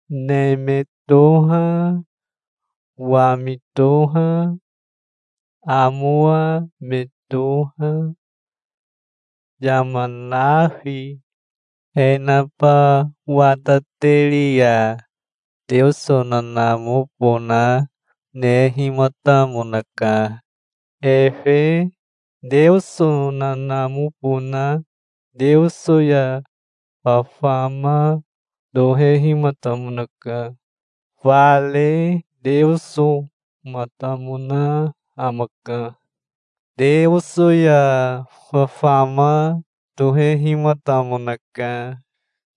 Neme toha, wami toha, amowa me toha, yama nafi, e naba watateri ya Teoso nanamobona nehimatamonaka. Efe Teoso nanamobona Teoso ya fafama tohehimatamonaka. Fare Teosomatamona amaka. Teoso ya fafama tohehimatamonaka,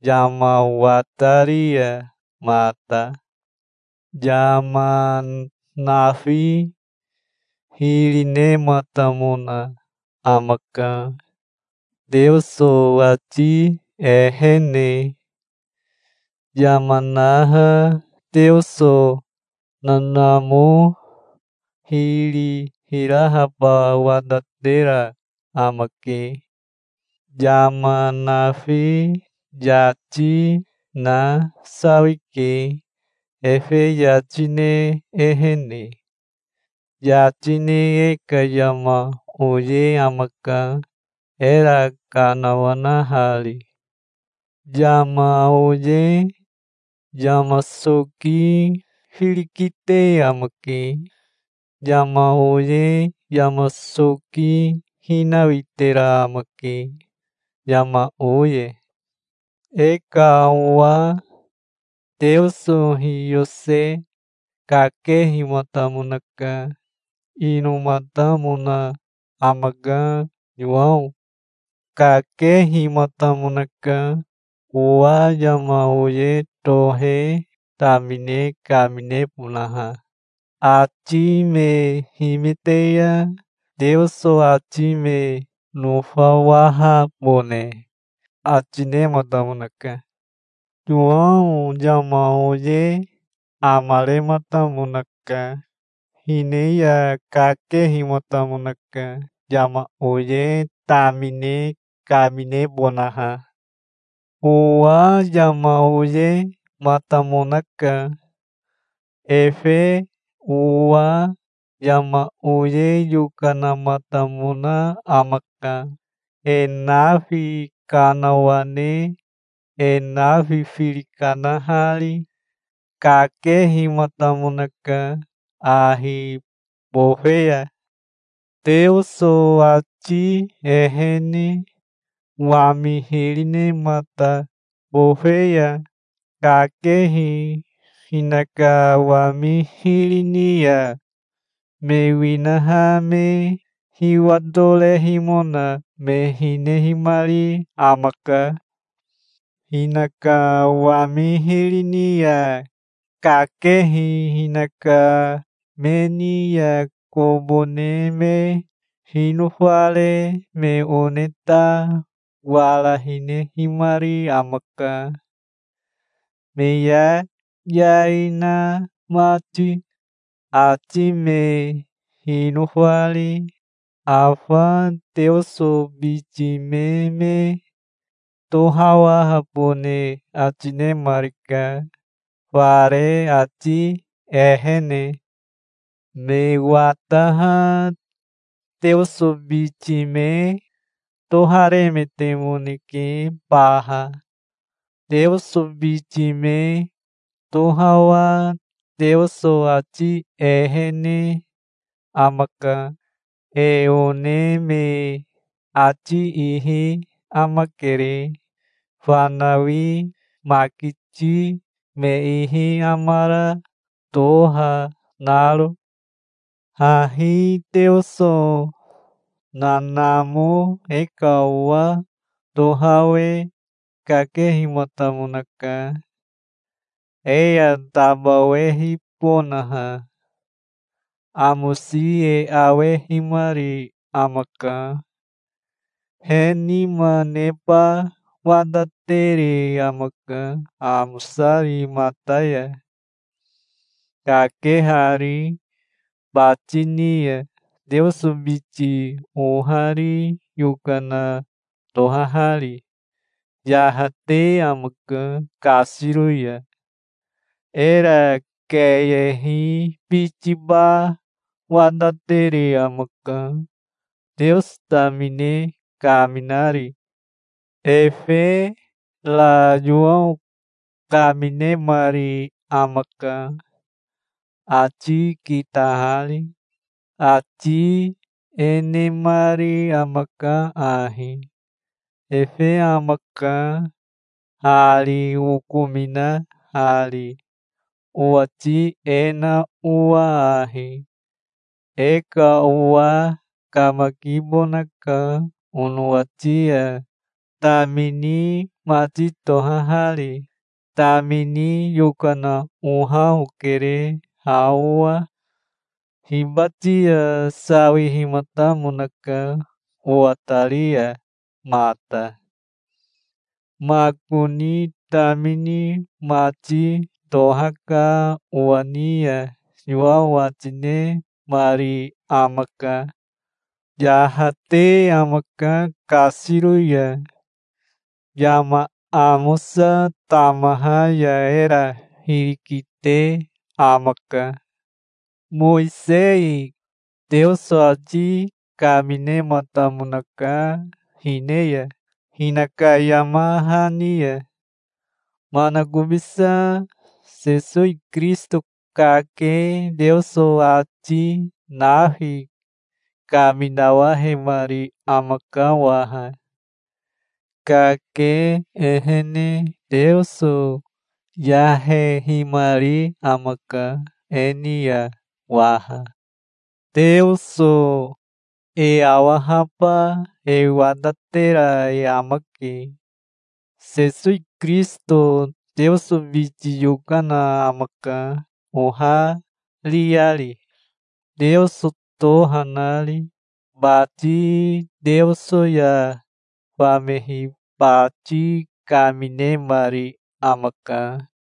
yama watari ya mata. Yama nafi hiri nematamona amaka, Teoso ati ehene. Yama naha Teoso nanamo hiri hirahaba watatera amake. Yama nafi yati na sawike efe yati ne ehene. Yati ne e ka yama oye amaka, era kanawanahari. Yama oye yama soki firi kite amake. Yama oye yama soki hinawitera amake, yama oye. E ka owa Teoso hiyose kakehimatamonaka. Inomatamona amaka Yowao. Kakehimatamonaka owa yama oye tohe tamine kaminebonaha. Ati me himite ya Teoso ati me nofawahabone ati nematamonaka. Yowao yama oye amarematamonaka. Hine ya kakehimatamonaka yama oye tamine kaminebonaha. Owa yama oyematamonaka. Efe owa yama oye yokanamatamona amaka, e nafi kanawane e nafi firi kanahari. Kakehimatamonaka ahi bofe ya. Teoso ati ehene wami hiri nemata bofe ya kakehi hinaka wami hiri ni ya me winaha me hiwatorehimona me hinehimari amaka. Hinaka wami hiri ni ya kakehi hinaka me ni ya kobo ne me hinofare me one ta wara hinehimari amaka, me yayai na mati, ati me hinofari. Afa Teoso biti me me tohawahabone ati nemarika, fare ati ehene. Me wataha Teoso biti me toharemetemoneke baha. Teoso biti me tohawaha Teoso ati ehene amaka. E one me ati ihi amakere, fanawi makiti me ihi amara toha naro. Hahi Teoso nanamo e ka owa tohawe kakehimatamonaka, e ya tabawehibonaha. Amosi e awehimari amaka. He nima neba watatere amaka amosari mata ya, kakehari bati ni ya, Teoso biti ohari yokana tohahari. Yahate amaka kasiro ya. Era keyehi bitiba watatere amaka, Teoso tamine kaminari. Efe ra Yowao kaminemari amaka, ati kitahari. Ati e nemari amaka ahi: "Efe amaka hari okominahari, owati e na owa ahi: E ka owa kamakibonaka onowati ya, tamini mati tohahari. Tamini yokana oha okere ha owa. Hibati ya sawihimatamonaka owatari ya mata. Makoni tamini mati tohaka owa ni ya", Yowao ati nemari amaka. Yahate amaka kasiro ya. Yama amosa tamaha ya era hiri kite amaka. Mowisei Teoso ati kaminematamonaka hine ya, hinaka yama hani ya. Manakobisa Sesowi Kirisito kake Teoso ati nafi kaminawahemari amaka waha. Kake ehene Teoso yahehimari amaka e ni ya waha. Teoso e awahaba e watatera e amake. Sesowi Kirisito Teoso biti yokana amaka ohariari, Teoso toha nari. Bati Teoso ya famehi bati kaminemari amaka.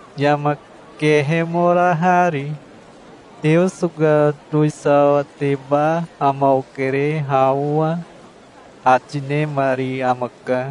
yama kehemorahari. "Teoso ka towisawateba ama okere ha owa", ati nemari amaka.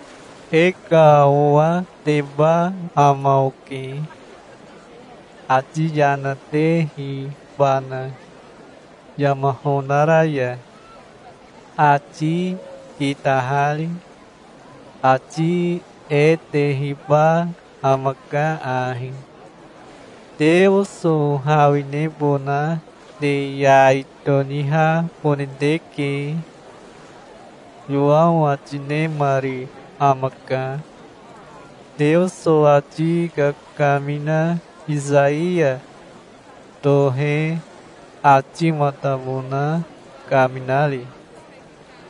"E ka owateba ama oke, ati yana tehibana yama honara ya, ati kitahari. Ati e tehiba amaka ahi: 'Teoso hawinebona te yai tonihabone teke'", Yowao ati nemari amaka, Teoso ati kakamina Isaiya tohe atimatamona kaminari.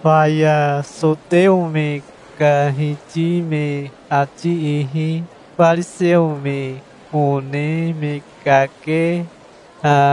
Faya soteo me ka hiti me ati ihi fariseo me one me kakeha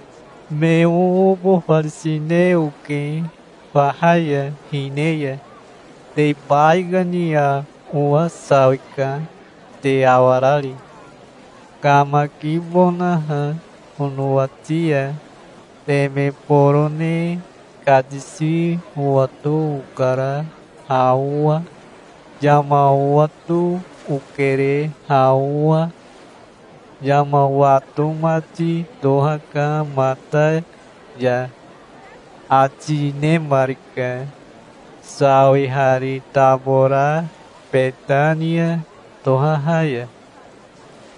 "Me oobofarisine oke faha ya hine ya. Te baikani ya owa sawika, te awarari, kamakibonaha onowati ya. Teme borone katisi owato okara ha owa. Yama owato okere ha owa. Yama wato mati tohaka mata ya", ati nemarika, sawihari tabora Betania tohaha ya,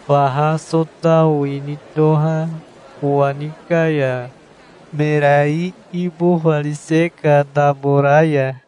faha Sotao ini toha kowani ka ya, mera iibofarise ka tabora ya.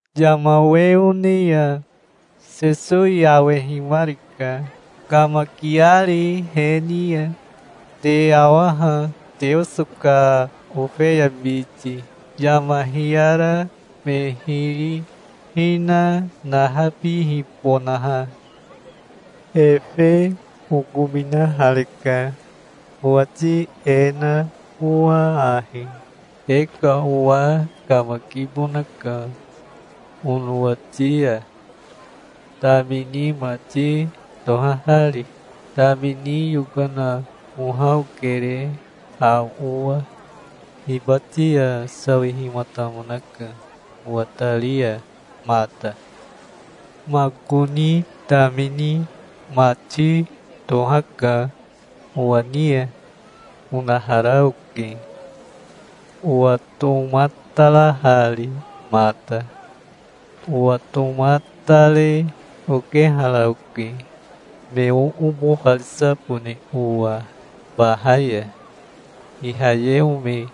Yama we one ya Sesowi awehimarika, kamakiari he ni ya. "Te awa ha, Teoso ka ofeya biti, yama hiyara me hiri hina nahabihibonaha. Efe okominahareka, owati e na owa ahi: 'E ka owa kamakibonaka onowati ya, tamini mati tohahari. Tamini yokana oha okere ha owa. Hibati ya sawihimatamonaka owatari ya mata. Makoni tamini mati tohaka owa ni ya', onahara oke, owatomatarahari mata. Owatomatare okehara oke, me oobofarisabone owa faha ya, Ihayeo me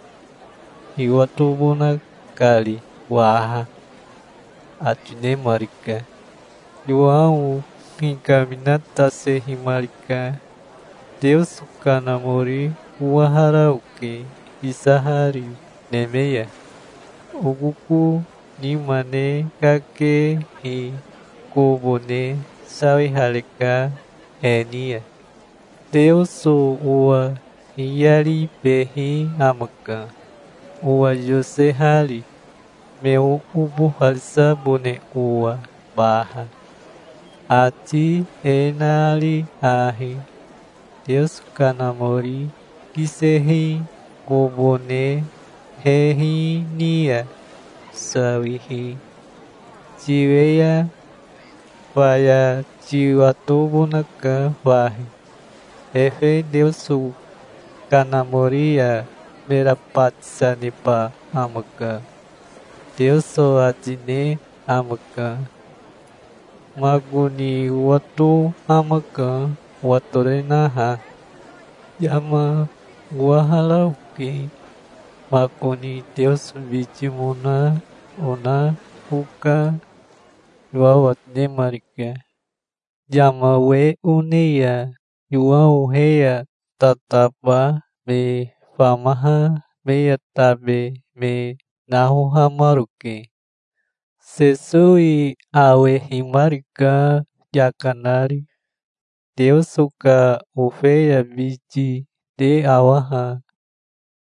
hiwatobona kari waha", ati nemarika. Yowao hikaminatasehimarika. "Teoso Kanamori owahara oke, kisahari neme ya. Okoko nima ne kakehi kobo ne sawihareka he ni ya. Teoso owa hiyaribehi amaka, owa yosehari, me oobofarisabone owa baha, ati e nari ahi: 'Teoso Kanamori kisehi kobo ne hehi ni ya sawihi tiwe ya faya tiwatobonaka fahi. Efe Teoso Kanamori ya mera batisa neba amaka', Teoso ati ne amaka. Makoni owato amaka, owatorenaha. Yama owahara oke. Makoni Teoso bitimona ona oka", Yowao ati nemarika. Yama we one ya Yowao he ya tataba me famaha me ya tabe me nahohamaroke. Sesowi awehimarika yaka nari. "Teoso ka ofeya biti te awa ha",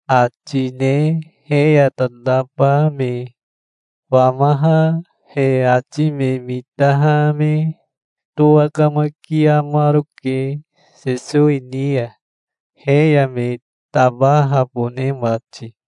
ati ne he ya tataba me famaha he ati me mitaha me towakamakiamaroke Sesowi ni ya, he ya me tabahabone mati.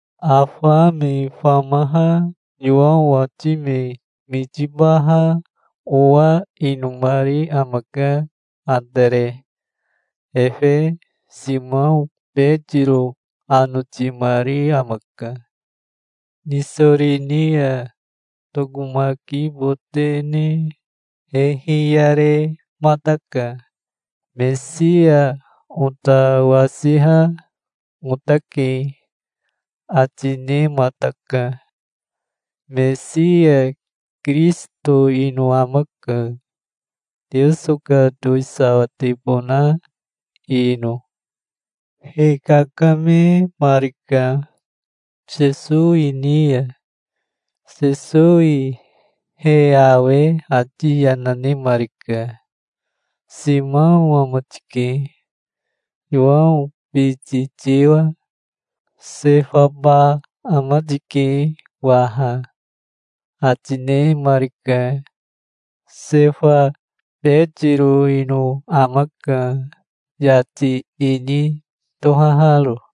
Afa me famaha Yowao ati me mitibaha owa inomari amaka Atere. Efe Simao Betiro anotimari amaka. Nisori ni ya tokomakibote ne he hiyaremataka. "Mesia ota wasiha otake", ati nemataka. Mesia Kirisito ino amaka, Teoso ka towisawatebona ino. He kakamemarika Sesowi ni ya. Sesowi he awe ati yana nemarika. "Simao ama tike, Yowao biti tiwa. Sefaba ama tike waha", ati nemarika. Sefa Betiro ino amaka, yati ini tohaharo.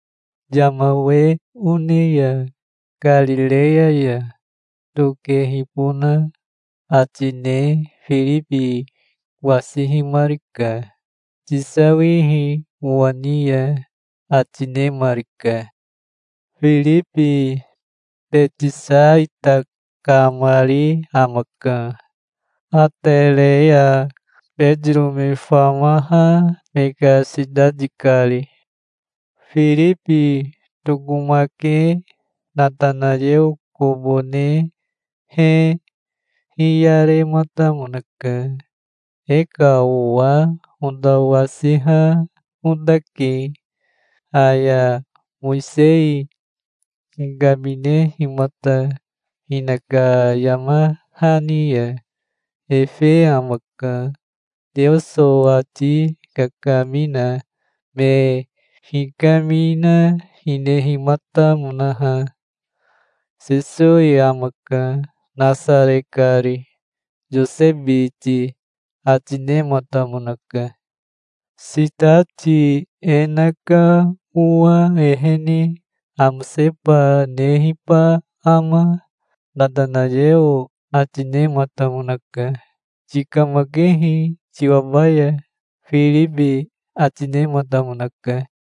Yama we one ya Karireya ya tokehibona ati ne Firibi wasihimarika. "Tisawihi owa ni ya", ati nemarika. Firibi Betisaita kamari amaka, Atere ya Betiro me famaha me ka sitati kari. Firibi tokomake Natanayeo kobo ne he hiyarematamonaka. "E ka owa ota wasiha otake, aya Mowisei hikaminehimata hinaka yama hani ya. Efe amaka, Teoso ati kakamina me hikamina hinehimatamonaha. Sesowi amaka, Nasare kari, Yose biti", ati nematamonaka. "Sitati e na ka owa ehene amoseba nehiba ama?" Natanayeo ati nematamonaka. "Tikamakehi, tiwabaya", Firibi ati nematamonaka.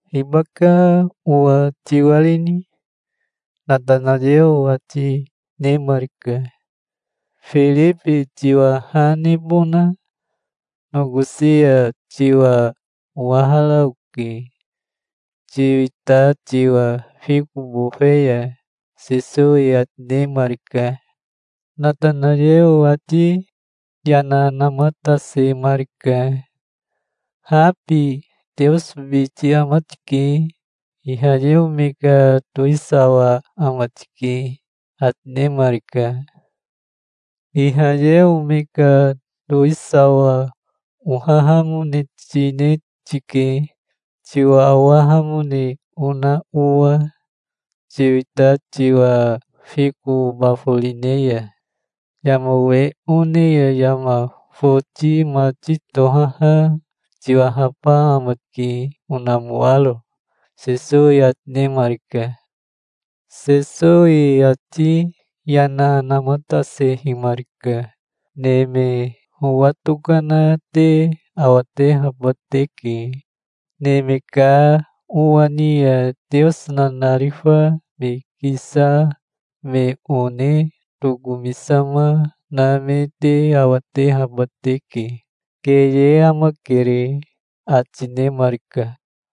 "Hibaka owa tiwarini?" Natanayeo ati nemarika. "Firibi tiwa ha nebona nokosi ya tiwa owahara oke, tiwita tiwa fiko bofe ya", Sesowi ati nemarika. Natanayeo ati yana namatasemarika. "Habi Teoso biti ama tike. Ihayeo me ka towisawa ama tike", ati nemarika. "Ihayeo me ka towisawa ohahamone tine tike, tiwa owahamone ona owa, tiwita tiwa fiko baforine ya. Yama we one ya yama foti mati tohaha tiwahaba ama tike onamoaro", Sesowi ati nemarika. Sesowi ati yana namatasehimarika. "Neme howa tokana te awatehaba teke. Neme ka Owa ni ya Teoso nanarifa me kisama me one tokomisama na me te awatehaba teke. Keye amakere", ati nemarika.